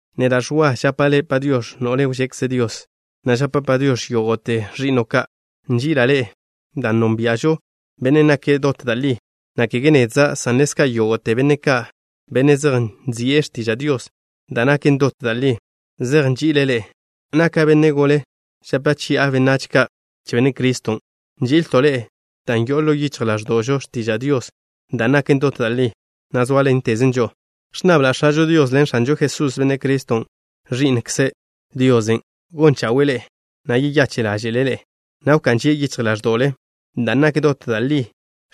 Neda', Ẕwa, žapa' le' “Padiox̱”, no'le wžekze Dios, na' žapa' “Padiox̱” yógo'te ẕi'no' ka'. Nži'ila' ḻe'e dan' nónbia'žo Benne' nake' dot da' li, na' kege nedza', san ḻezka' yógo'te benne' ka', benne' zej nzi'e x̱tiža' Dios da' naken dot da' li, zej nži'ile' ḻe'e. Naka' benne' gole, žape chi'a benách ka' che Benne' Criston'. Nži'ilto' ḻe'e dan' yo'o ḻo yichj ḻáẕdo'žo x̱tiža' Dios da' naken dot da' li, na' sóaḻentezen žo'o. Ẕnnabla' X̱ažo Dios ḻen X̱anžo Jesús, Benne' Criston', Ẕi'nkze Diosen', gon chawe'e ḻe'e, na' yeyache' ḻáže'le' ḻe'e, na' wká'n žie' yichj ḻáẕdo'le dan' nak dot da' li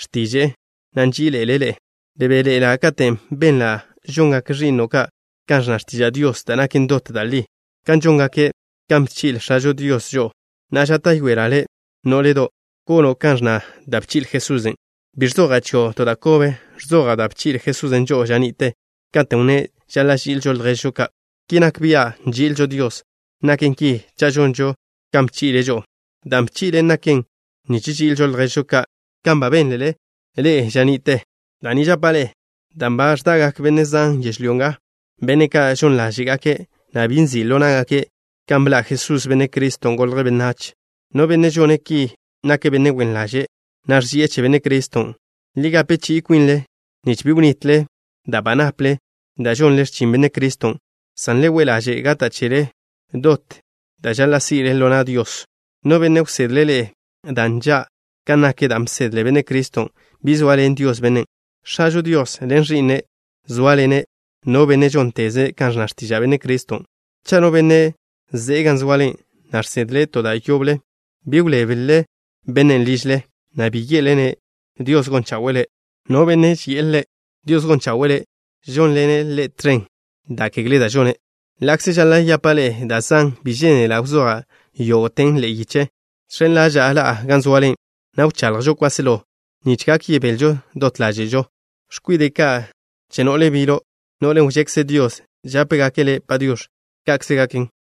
x̱tiže'e, na' nži'ile' ḻe'e. Bebéḻe'ela' katen' benla' žongak ẕi'no' ka' kan ẕnna x̱tiža' Dios da' naken dot da' li, dan' žóngake' kan bchi'le X̱ažo Dios žo'o. Na'a, žáta'yoela' le', nó'ledo', gono' kan ẕnna da' bchi'le Jesusen'. Bi ẕzoja' chio' to da' kobe. Ẕzoja' da' bchi'le Jesusen' žo'o ža ni'te, katen' wnné' žaḻa' ži'ilžo lježžo ka'. Ki nak bia' nži'ilžo Dios. Naken ki cha' žonžo kan bchi'le' žo'o. Dan' bchi'le' naken nich ži'ilžo lježžo ka' kan ba bénlele ḻe'e ža ni'te. Da' ni žapa' ḻe'e: dan' ba ẕdagak benne' zan yežlyó nga, benne' ka' žon ḻáže'gake', na' bi nzi' ḻo ná'gake' kan bḻa' Jesús, Benne' Criston', golje' benách. No benne' žone' ki, nake' benne' wen ḻaže', na' ẕži'e che Benne' Criston'. Le gape chi'i kwinle nich bi wnitle da' ba naple dan' žonle x̱chin Benne' Criston', san le we' ḻaže' gata' chele dot da' žaḻa' si'le ḻo na' Dios. No benne' wsedle' ḻe'e da' nža' kan nak dan' bsedle Benne' Criston', bi zoaḻen Dios bennen'. X̱ažo Dios ḻen Ẕi'nen' zóaḻene' no benne' žónteze' ka ẕnna x̱tiža' Benne' Criston'. Cha' no benne' ze'e gan zoale, na' žsedle' to da' yoble, bi wléblele bennen' ližle, na' bi ye'le-ne': “Dios gon chawe'e le'.” No benne' ži'e ḻe': “Dios gon chawe'e le'”, žónḻene' ḻe' tẕen da' kegle da' žone'. Ḻa'kze žaḻa' yapa' ḻe'e da' zan, bi žénela' wzoja' yógo'ten ḻe'e yiche. Žx̱en ḻaža'a ḻa'a gan zoale, na' wchaḻjžo kwáselo, nich gak yebelžo dot ḻáže'žo. X̱kwide' ka' che no'le bilo', no'len' wžekze Dios, žápegake' le' “Padiox̱.” Ka'kze gaken.